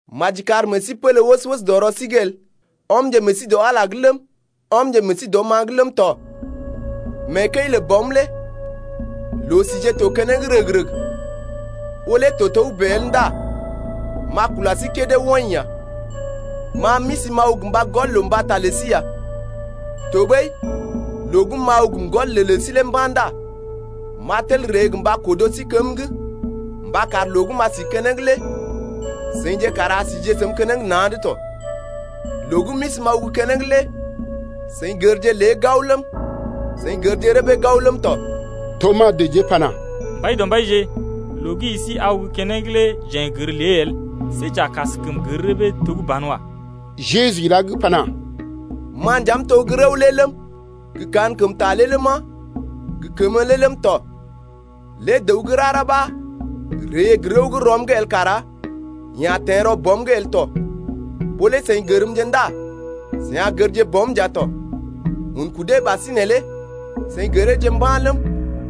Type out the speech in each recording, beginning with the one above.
Maji kar meḛ sí pélé wəs-wəs dɔ rɔ sí’g el. Ɔmje meḛ sí dɔ Ala’g lé ləm, ɔmje meḛ sí dɔm-ma’g ləm tɔ. Mee kəi lə Bɔm lé loo-sije to keneŋ rəg-rəg. Ɓó lé to togə́bè el ndá m’a kula sí kédé woḭ ya. Ma m’isi m’aw gə mba gɔl loo mbata lə sí ya. Tɔɓəi loo gə́ m’aw gə m’gɔl loo lə sí lé mba̰ ndá m’a tel ree gə mba kodo sí kém’g mba kar loo gə́ m’a si keneŋ lé seḭje kara a sije səm keneŋ na̰’d tɔ. Loo gə́ m’isi m’aw gə́ keneŋ lé seḭ gərje lé gao ləm, seḭ gərje rəbee gao ləm tɔ. Tomas dəjee pana: Mbaidɔmbaije, loo gə́ i si aw gə́ keneŋ lé jeḛ n’gər lée el, see j’a kaskəm gər rəbee to gə́ banwa. Jeju ilá’g pana: Ma nja m’to gə́ rəw lé ləm, gə kankəmta lé ləma, gə kəmə lé ləm tɔ. Lé dəw gə́ rara ɓa ree gə rəw gə́ rɔm’g el kara yeḛ a teḛ rɔ Bɔm’g el tɔ. Ɓó lé seḭ gərmje ndá seḭ a gərje Bɔm nja tɔ. Un kudee ɓasinè lé seḭ gəreeje mba̰ ləm,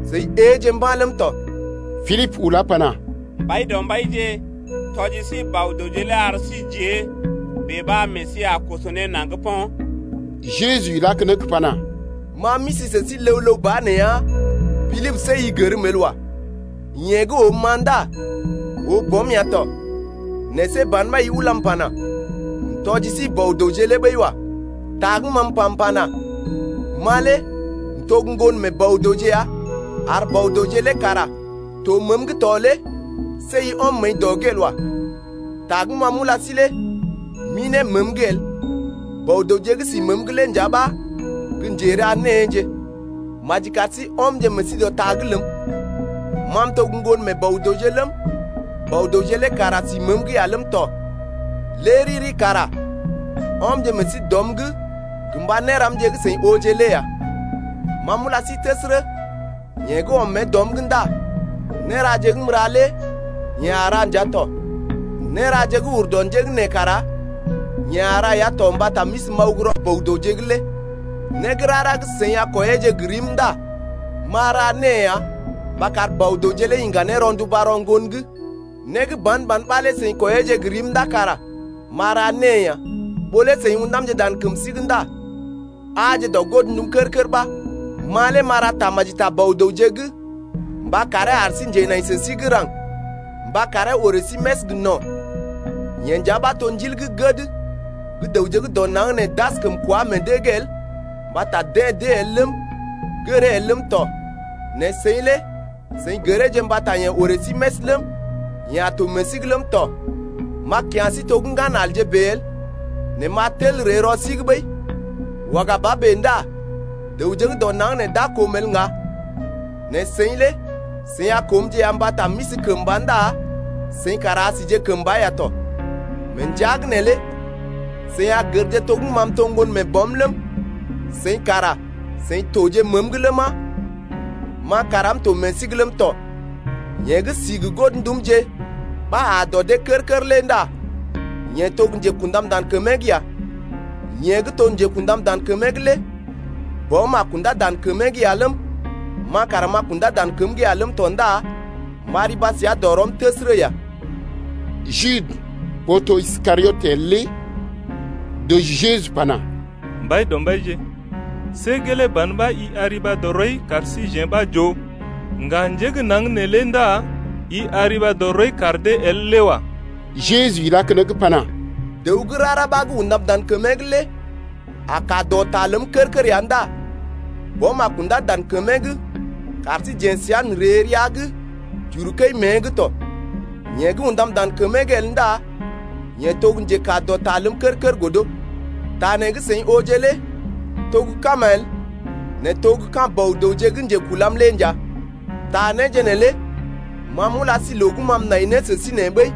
seḭ éeje mba̰ ləm tɔ. Pilibə ulá pana: Mbaidɔmbaije, tɔji sí Bɔ-dəwje lé ar sí j’ée, bèe ɓa meḛ sí a koso ne naŋg po̰. Jeju ilá keneŋ pana: Ma m’isi sə sí ləw-ləw ba nee ya Pilibə, see i gərm el wa. Yeḛ gə́ oom-ma ndá oo Bɔm ya tɔ, nɛ see ban ɓa i ulam pana: M’tɔji sí Bɔ-dəwje lé ɓəi wa. Ta gə́ ma m’pa m’pana: Ma lé m’to gə́ Ŋgon mee Bɔ-dəwje ya ar Bɔ-dəwje lé kara to məəm’g to lé see i ɔm məəi dɔ’g el wa. Ta gə́ ma m’ulá sí lé m’ḭ ne məəm’g el. Bɔ-dəwje gə́ si məəm’g lé nja ɓa gə́ njera néeje. Maji kar sí ɔmje meḛ sí dɔ ta’g ləm, ma m’to gə́ Ŋgon mee Bɔ-dəwje ləm, Bɔ-dəwje lé kara si məəm’g ya ləm tɔ, lé riri kara ɔmje meḛ sí dɔm’g gə mba néramje gə́ seḭ ooje lé ya. Ma m’ula sí təsərə, yeḛ gə́ ɔm mée dɔm’g ndá néraje gə́ m’ra lé yeḛ a ra nja tɔ. Néraje gə́ ur dɔ njé gə́ nee kara yeḛ a ra ya tɔ mbata m’isi m’aw gə́ rɔ Bɔ-dəwje’g lé. Né gə́ rara gə́ seḭ a kwɔiyeeje gə rim ndá m’a ra née ya mba kar Bɔ-dəwje lé iŋga ne rɔnduba rɔ Ŋgon’g. Né gə́ ban-ban ɓa lé seḭ kwɔiyeeje gə rim ndá kara m’a ra née ya. Ɓó lé seḭ ṵdamje dan kəm sí’g ndá aaje dɔ godndum kər-kər ɓa. Ma lé m’a ra tamaji ta Bɔ-dəwje’g mba karee ar sí njenai sə sí gə́ raŋg mba karee orè sí més gə no̰. Yeḛ nja ɓa to Ndil gə́ gəd gə́ dəwje gə́ dɔ naŋg nee d’askəm kwá meḛ dee’g el mbata deḛ d’ée el ləm, gəree el ləm tɔ. Nɛ seḭ lé seḭ gəreeje mbata yeḛ orè sí més ləm, yeḛ a to meḛ sí’g ləm tɔ. M’a kya̰ sí to gə́ ŋganalje bèe el, nɛ m’a tel ree rɔ sí’g ɓəi. Waga ba bèe ndá dəwje gə́ dɔ naŋg nee d’a koom el ŋga, nɛ seḭ lé seḭ a koomje ya mbata m’isi kəmba ndá seḭ kara a sije kəmba ya tɔ. Mee ndəa’g neelé seḭ a gərje to gə́ ma m’to Ŋgon mee Bɔm ləm, seḭ kara seḭ toje məəm’g ləma, ma kara m’to meḛ sí’g ləm tɔ. Yeḛ gə́ si gə godndumje ɓa aa dɔ dee kər-kər lé ndá yeḛ to gə́ njekṵdam dan kəmee’g ya, yeḛ gə́ to gə́ njekṵdam dan kəmee’g lé Bɔm a kundá dan kəmee’g ya ləm, ma kara m’a kundá dan kəm’g ya ləm tɔ ndá m’a riba səa dɔ rɔm təsərə ya. Jude, ɓó to Iskariot el lé dəji Jeju pana: Mbaidɔmbaije, see gelee ban ɓa i a riba dɔ rɔi kar síjeḛ ɓa j’oo, ŋga njé gə́ naŋg neelé ndá i a riba dɔ rɔi kar dee el lé wa. Jeju ilá keneŋ pana: Dəw gə́ rara ɓa gə́ undam dan kəmee’g lé a kaa dɔ ta ləm kər-kər ya ndá Bɔm a kundá dan kəmee’g kar síjeḛ səa n’ree rəa’g j’uru kəi mée’g tɔ. Yeḛ gə́ undam dan kəmee’g el ndá yeḛ to gə́ njekaa dɔ ta ləm kər-kər el. Ta nee gə́ seḭ ooje lé to gə́ kama el, nɛ to gə́ ka̰ Bɔ-dəwje gə́ njekulam lé nja. Ta néje neelé ma m’ula sí loo gə́ ma m’nai ne sə sí nee ɓəi.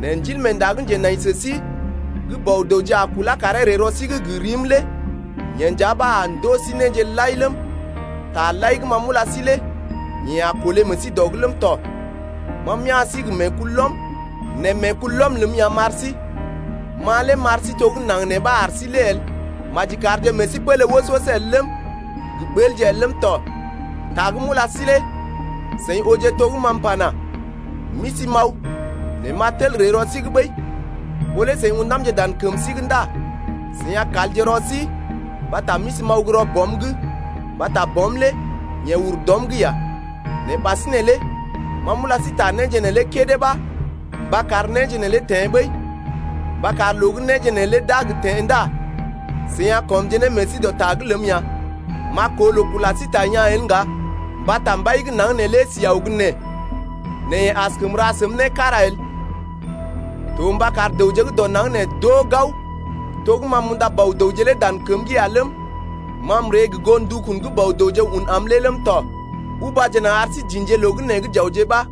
Nɛ Ndilmeenda gə́ njenai sə sí gə́ Bɔ-dəwje a kulá karee ree rɔ sí’g gə rim lé yeḛ nja ɓa a ndoo sí néje lai ləm, taje lai gə́ ma m’ula sí lé yeḛ a kolé meḛ sí dɔ’g ləm tɔ. Ma m’ya̰ sí gə meekulɔm, nɛ meekulɔm ləm ya m’ar sí. Ma lé m’ar sí to gə́ naŋg nee ɓa ar sí lé el. Maji karje meḛ sí pélé wəs-wəs el ləm, gə ɓəlje el ləm tɔ. Ta gə́ m’ula sí lé seḭ ooje to gə́ ma m’pana: M’isi m’aw, nɛ m’a tel ree rɔ sí’g ɓəi. Ɓó lé seḭ ṵdamje dan kəm sí’g ndá seḭ a kalje rɔ sí mbata m’isi m’aw gə́ rɔ Bɔm’g, mbata Bɔm lé yeḛ ur dɔm’g ya. Nɛ ɓasinè lé ma m’ula sí ta néje neelé kédé ɓa mba kar néje neelé teḛ ɓəi, mba kar loo gə́ néje neelé d’a gə teḛ ndá seḭ a kɔmje ne meḛ sí dɔ ta’g ləm ya. M’a koo loo kula sí ta yaa̰ el ŋga, mbata mbai gə́ naŋg neelé si aw gə́ nee. Nɛ yeḛ askəm ra səm né kára el. To mba kar dəwje gə́ dɔ naŋg nee d’oo gao, to gə́ ma m’unda Bɔ-dəwje lé dan kəm’g ya ləm, ma m’ree gə goo ndukun gə́ Bɔ-dəwje un am lé ləm tɔ. Ubaje naŋg ar sí j’ḭje loo gə́ nee j’awje ɓa.